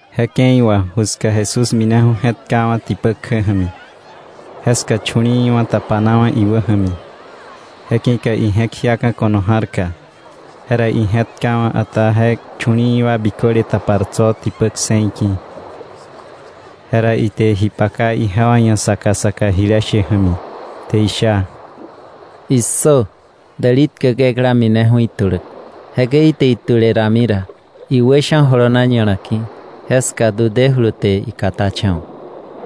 Je ke̱i wà ju ska Jesús mineju̱ je̱tkawa̱ tipä kjä ja̱mi. Jeska chu̱li̱i̱wa̱ tapanawa̱ iwä ja̱mi, je ki̱ka ije̱k jiaka̱ ko̱no ja̱rka, jera ije̱tkawa̱, ata je chu̱li̱i̱ wa biköle tapar tso̱ tipä kse̱i ki̱. Jera ite ji paka ijewa ia̱ saka saka jile she ja̱mi, te isha: “¡Issö! Däli tkäk ekla mineju̱ ituläk. Jekäi ite itule rami ra, iwä sha̱ jolona ña̱la ki̱, jeska du dejulu te ikatacha̱wa̱.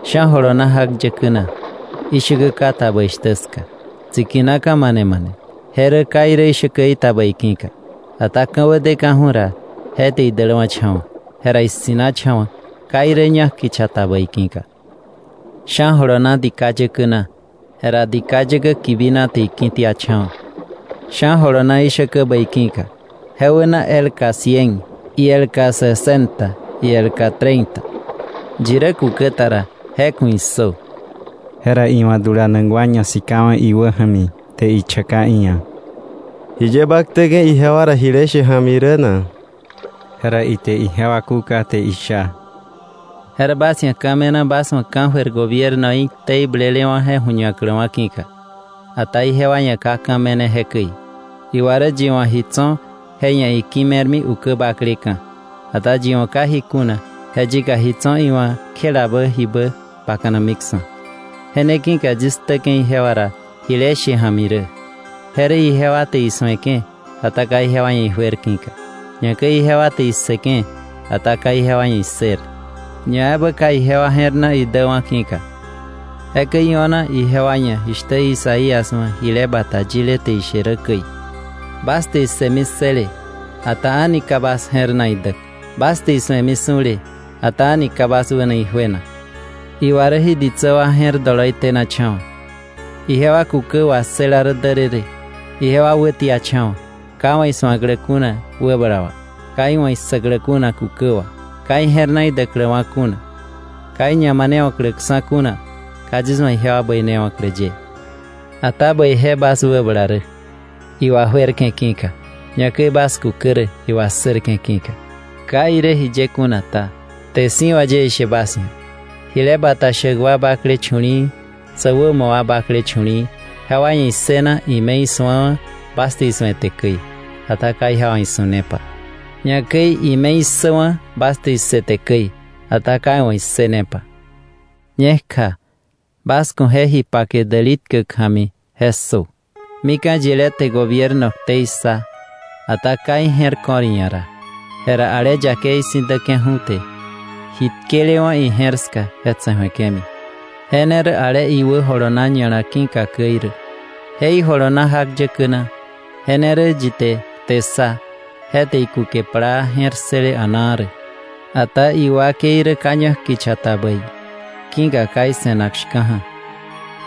Sha̱ jolona jak yäkä na, ishäkä ka ta bäi shtä ska, tsikinaka̱ mane mane, je rä ka irä ishäkäí ta bäi ki̱ka. Ata ka̱wä deka̱ju̱ ra, je te idäläwa̱cha̱wa̱; jera issi̱nacha̱wa̱, ka irä ñak kicha ta bäi ki̱ka. Sha̱ jolona dika yäkä na, jera je dika yäkä kibina te iki̱tiacha̱wa̱. Sha̱ jolona ishäkä bäi ki̱ka, je wäna elka cien, ielka sesenta, ielka treinta. Yi rä kukä ta ra, ¡je ku̱ issö!” Jera iwa̱ dulanak wa ñasikawa̱ iwä ja̱mi te ichaka iia̱: —¿Jiye ba ktäke̱ ijewa ra jile she ja̱mi rä na? Jera ite ijewa kúka te isha: —Je rä bas ia̱ ka̱ me̱na bas wa̱ ka̱jöir gobiernoí ktei blelewa̱ je ju̱ñakläwa̱ ki̱ka, ata ijewa ia̱ ka ka̱ me̱ne jekäi. Iwa rä yi wa̱ ji tso̱, je ia̱ iki̱ me̱rmi ukä bakleka̱. Ata yi wa̱ ka ji kuna, je yika ji tso̱ iwa̱ kjelabä jibä bakanamiksa̱. Je ne ki̱ka yis ktäke̱ ijewa ra jile she ja̱mi rä. Je rä ijewa te isu̱eke̱, ata ka ijewa ia̱ ijuer ki̱ka, ñakäi ijewa te issëke̱, ata ka ijewa ia̱ issër, ñaebä ka ijewa je̱r na idäwa̱ ki̱ka. Jekäi io̱na ijewa ia̱ jishtä Isaías wa̱ jile bata yile te ishe rä käi: ‘Bas te issëmi ssële, ata a̱ni ka bas je̱r na idäk, Bas te isu̱emi su̱le, ata a̱ni ka bas wäna ijuenak, Iwa rä jí ditsä wa je̱r doloi tenacha̱wa̱, ijewa kukä wassëla rä därërë, ijewa wätiacha̱wa̱, ka iwa̱ isu̱aklä kuna wäbala wà, ka iwa̱ issäklä kuna kukä wà, ka ije̱r na idäkläwa̱ kuna, ka iñamanewa̱kläksa̱ kuna, ka yis wa̱ ijewa bäinewa̱klä ye.’ “Ata bäije bas wäbala rä, iwajuerke̱ ki̱ka, ñakäi bas kukä rä, iwassërke̱ ki̱ka. Ka irä jiye kuna ta, kte si̱ wà yie ishe bas ia̱, jile bata shäk wa bakle chu̱li̱i̱, sä wämo wa bakle chu̱li̱i̱, jewa ia̱ issëna ime isu̱awa̱ bas te isu̱ete käi, ata ka iwa̱ isu̱nepa; ñakäi ime issäwa̱ bas te issëte käi, ata ka iwa̱ issënepa. “Ñekja, bas ku̱ je ji pake däli tkäk ja̱mi je ssö. Mika̱ yilé te gobierno ktei ssa, ata ka ije̱r ko̱r iia̱ ra, jera ale yakei si̱ däke̱ju̱, te ji tkelewa̱ ije̱r ska tse̱ju̱eke̱mi; je ne rä ale iwä jolona ña̱la ki̱ka käi rä. Je ijolona jak yäkä na, je ne rä yi te kte ssa, je te ikuke plaa je̱r ssële a̱naa rä. Ata iwakei rä ka ñak kicha ta bäi, ki̱ka ka ise̱nak shka̱ja̱;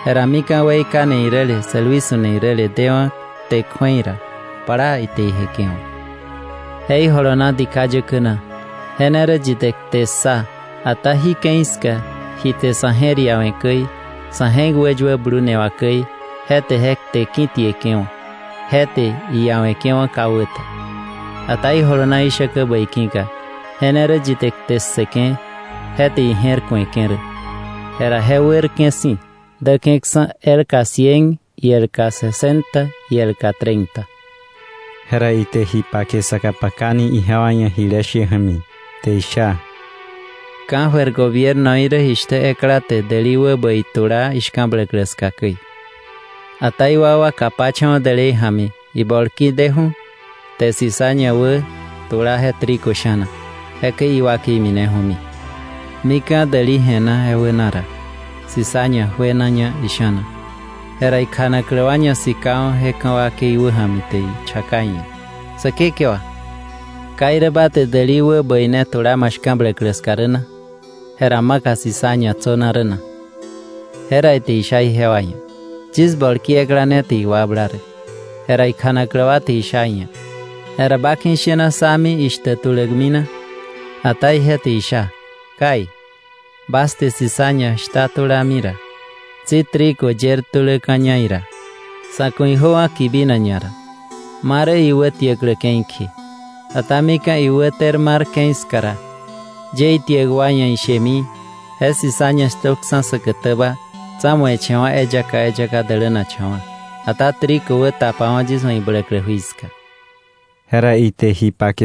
jera mika̱ weikane iräle, sälwi su̱ne iräle dewa̱ kte kju̱ei ra, plaa ite ijeke̱wa̱. Je ijolona dika yäkä na, je ne rä yi te kte ssa, ata jí ke̱i ska ji te sa̱ je̱r iawe̱ käi, sa̱ je̱k wäyuä blune wà käi, je te je kte ki̱tieke̱wa̱, je te iawe̱ke̱wa̱ ka wä ta. Ata ijolona ishäkä bäi ki̱ka, je ne rä yi te kte ssëke̱ je te ije̱r ku̱eke̱ rä, jera je wärke̱ si̱, däke̱ksa̱ elka cien, ielka sesenta, ielka treinta.” Jera ite isaka pakani ijewa ia̱ jile she ja̱mi te isha: “Ka̱jöir gobiernoí rä jishtä ekla te däli wä bäi tula ishka̱bläklä ska käi. Ata iwakwa kapacha̱wa̱ dälei ja̱mi, ibolki deju̱, te cizaña wä tula je trigo sha̱na, jekäi iwakei mineju̱mi. Mika̱ däli je̱na, je wäna ra, cizaña juenaña isha̱na. Jera ikjanaklä wa ñasikawa̱ je ka̱ wakei wäja̱mi te ichaka iia̱: ‘Säkekewa, ¿ka irä ba te däli wä bäi ne tula ma shka̱bläklä ska rä na? Jera ¿maka cizaña tsöna rä na?’ Jera ite isha ijewa ia̱: ‘Yis bolki ekla ne te iwakbla rä.’ Jera ikjanaklä wa te isha iia̱: ‘Jera ba ki̱ ishena sá mi ishtäk tulämi na?’ Ata ije te isha: ‘Kai, bas te cizaña shta tulami ra, tsi trigo yer tuläka̱ña ira. Sa̱ ku̱ ijöwa̱ kibinak ñara ma rä iwätiäklä ke̱i kje. Ata mika̱ iwä ter mar ke̱i ska ra, yie itiäk wa ia̱ ishemi; je cizaña shtökksa̱ säkätäba, tsa̱mueche̱wa̱ eyaka eyaka dälänakcha̱wa̱, ata trigo wä tapawo̱ yis wa̱ ibläklä jui ska.’” Jera ite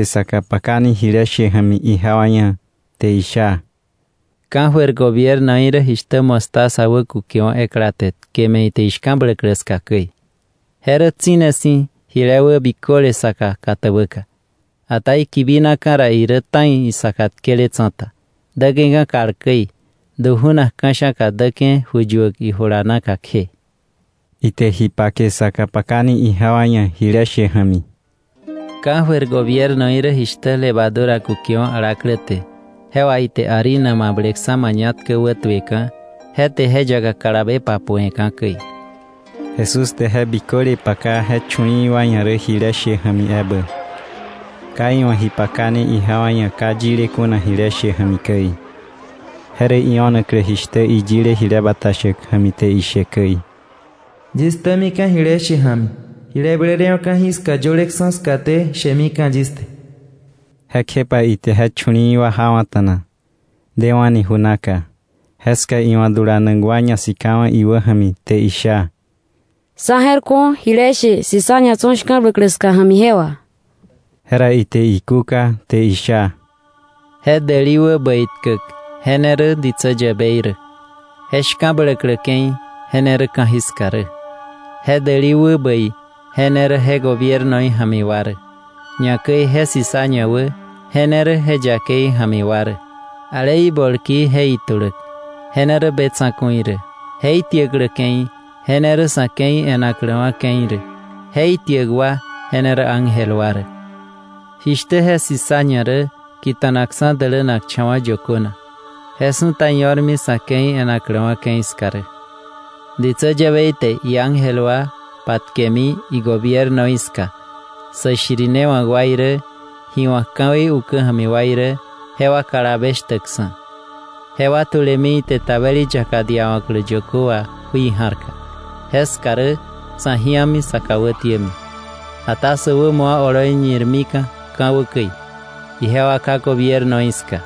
isaka pakani jile she ja̱mi ijewa ia̱, te isha: “Ka̱jöir gobiernoí rä jishtä mostaza wä kukewa̱ ekla te tkeme̱ ite ishka̱bläklä ska käi. Je rä tsi̱ne si̱ jile wä biköle saka katäbäka, ata ikibinaka̱ ra irä ta̱i isaka tkele tsa̱ta, däke̱ka̱ kal käi, du ju̱nak ka̱sha̱ka däke̱ ju yuäk ijula naka kje.” Ite isaka pakani ijewa ia̱ jile she ja̱mi: “Ka̱jöir gobiernoí rä jishtä levadura kukewa̱ alaklä te je wà ite harina mableleksa̱ mañatkä wätueka̱, je te je yaka kalabe papu̱we̱ka̱ käi.” Jesús te je biköle paka je chu̱li̱i̱ wa ia̱ rä jile she ja̱mi ebä. Ka iwa̱ ji pakane ijewa ia̱ ka yile kuna jile she ja̱mi käi. Je rä io̱naklä jishtä iyile jile bata shäk ja̱mi te ishe käi: “Yis ktämika̱ jile she ja̱mi. Jile blelewa̱ ka̱jiska yöleksa̱ skaté, shemika̱ yis te.” Jekjepa ite je chu̱li̱i̱ wa jawa̱ta̱na, dewa̱ni ju naka. Jeska iwa̱ dulanak wa ñasikawa̱ iwä ja̱mi te isha: —Sá je̱r ku̱o, jile she cizaña tso̱ shka̱bläklä ska ja̱mi, je wà. Jera ite ikúka te isha: —Je däli wä bäi tkäk je ne rä ditsä yäbei rä. Je shka̱bläklä ke̱i, je ne rä ka̱jiska rä. Je däli wä bäi, je ne rä je gobiernoí ja̱mi wa rä. Ñakäi je cizaña wä, je ne rä je yakei ja̱mi wa rä. Ale ibolki je ituläk, je ne rä be tsa̱ku̱i rä. Je itiäklä ke̱i, je ne rä sa̱ ke̱i e̱nakläwa̱ ke̱i rä; je itiäk wa, je ne rä ángel wa rä. Jishtä je cizaña rä kita̱nakksa̱ dälänakcha̱wa̱ yökö na, je su̱ta io̱rmi sa̱ ke̱i e̱nakläwa̱ ke̱i ska rä. Ditsä yäbei te iángel wa patkemi igobiernoí ska sä shirinewa̱k wa irä, ji wa̱k ka̱wei ukä ja̱mi wa irä jewa kalabe shtäkksa̱, jewa tulemi ite tabeli yaka diawa̱klä yökö wà jui ja̱rka; jeska rä sa̱ ji̱ami, sa kà wätiämi. Ata sä wämo wa oloi ñirmika̱ ka̱wä käi, ijewa Ká gobiernoí ska.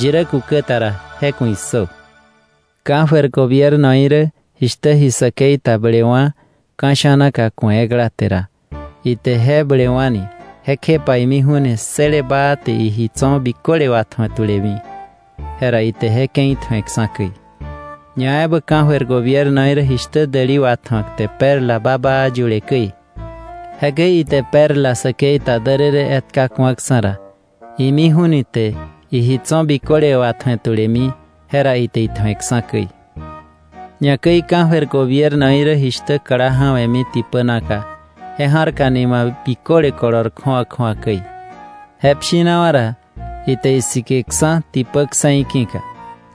Yi rä kukä ta ra, ¡je ku̱ issö! “Ka̱jöir gobiernoí rä jishtä ji säkei ta blelewa̱ ka̱ sha̱naka ku̱e ekla te ra, ite je blewa̱ni, kjepa imiju̱ ni ssële baa te iji tso̱ biköle watju̱e tulemi, jera ite je ke̱i tju̱eksa̱ käi. “Ñaebä ka̱jöir gobiernoí rä jishtä däli watju̱ak te perla babaa yule käi; jekäi ite perla säkei ta därërë etka ku̱aksa̱ ra, imiju̱ ni te iji tso̱ biköle watju̱e tulemi, je ra ite itju̱eksa̱ käi. “Ñakäi ka̱jöir gobiernoí rä jishtä kla ja̱we̱mi tipä naka, je ja̱rka nima biköle kolor kju̱awa kju̱awa käi; je pshinawa̱ ra, ite isikeksa̱ tipä kse̱i ki̱ka,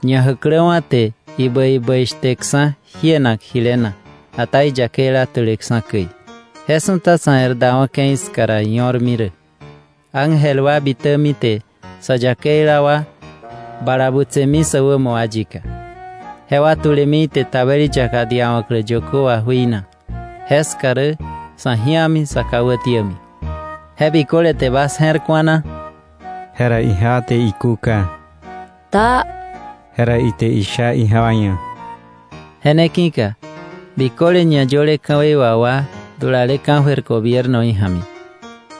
ñajäkläwa̱ te ibäi bäi shtekksa̱ jienak jile na, ata iyakeila tuleksa̱ käi. Je su̱ta sa̱ e̱r dawa̱ ke̱i ska ra io̱rmi rä: ángel wa bitämi te sa yakeila wa bala butsemiksa̱ sä wämo wa yika, jewa tulemi ite tabeli yaka diawa̱klä yökö wà jui na; jeska rä sa̱ ji̱ami, sä kà wätiämi.” ¿Je biköle te bas je̱r ku̱a na? Jera ijewa te ikúka: —Taa. Jera ite isha ijewa ia̱: —Je ne ki̱ka biköle ñayöle ka̱wei wà wa dulale ka̱jöir gobiernoí ja̱mi,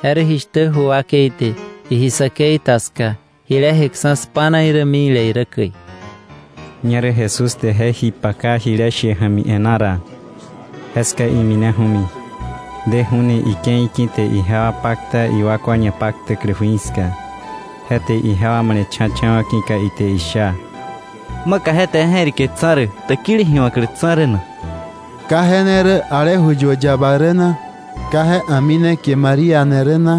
je rä jishtä ju wakei te iji säkei ta ska jile jeksa̱ spa̱na irä mikle irä käi. Ñerä Jesús te je ji paka jile she ja̱mi e̱ná ra, jeska imineju̱mi; deju̱ ni ike̱i ki̱ te ijewa pakta iwakwa ñapaktäklä jui ska, je te ijewa male̱cha̱cha̱wa̱ ki̱ka ite isha: —¿Maka ije te je je̱rike tsa̱ rä, täkili ji wa̱klä tsa̱ rä na? ¿Ka je ne rä ale ju yuäk yaba rä na? ¿Ka je a̱mi ne kie María ni rä na,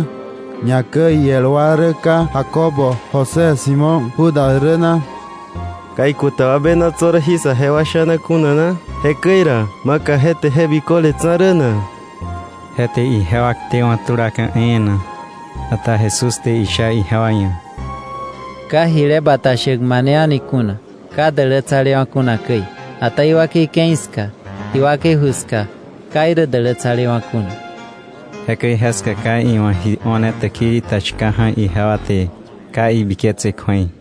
ñakäi iel wa rä ka Jacobo, José, Simón, Judas rä na? ¿Ka ikuta wa bena tso̱ rä jí sajewa sha̱na kuna na? Jekäi ra, ¿maka je te je biköle tsa̱ rä na? Je te ijewa ktewa̱ tulaka̱ e̱e̱na. Ata Jesús te isha ijewa ia̱: —Ka jile bata shäk mane a̱ni kuna ka dälätsalewa̱ kuna käi, ata iwakei ke̱i ska, iwakei ju ska ka irä dälätsalewa̱ kuna. Jekäi jeska ka iwa̱ ji o̱ne täkili ta shka̱ja̱, ijewa te ka ibiketse kju̱ei.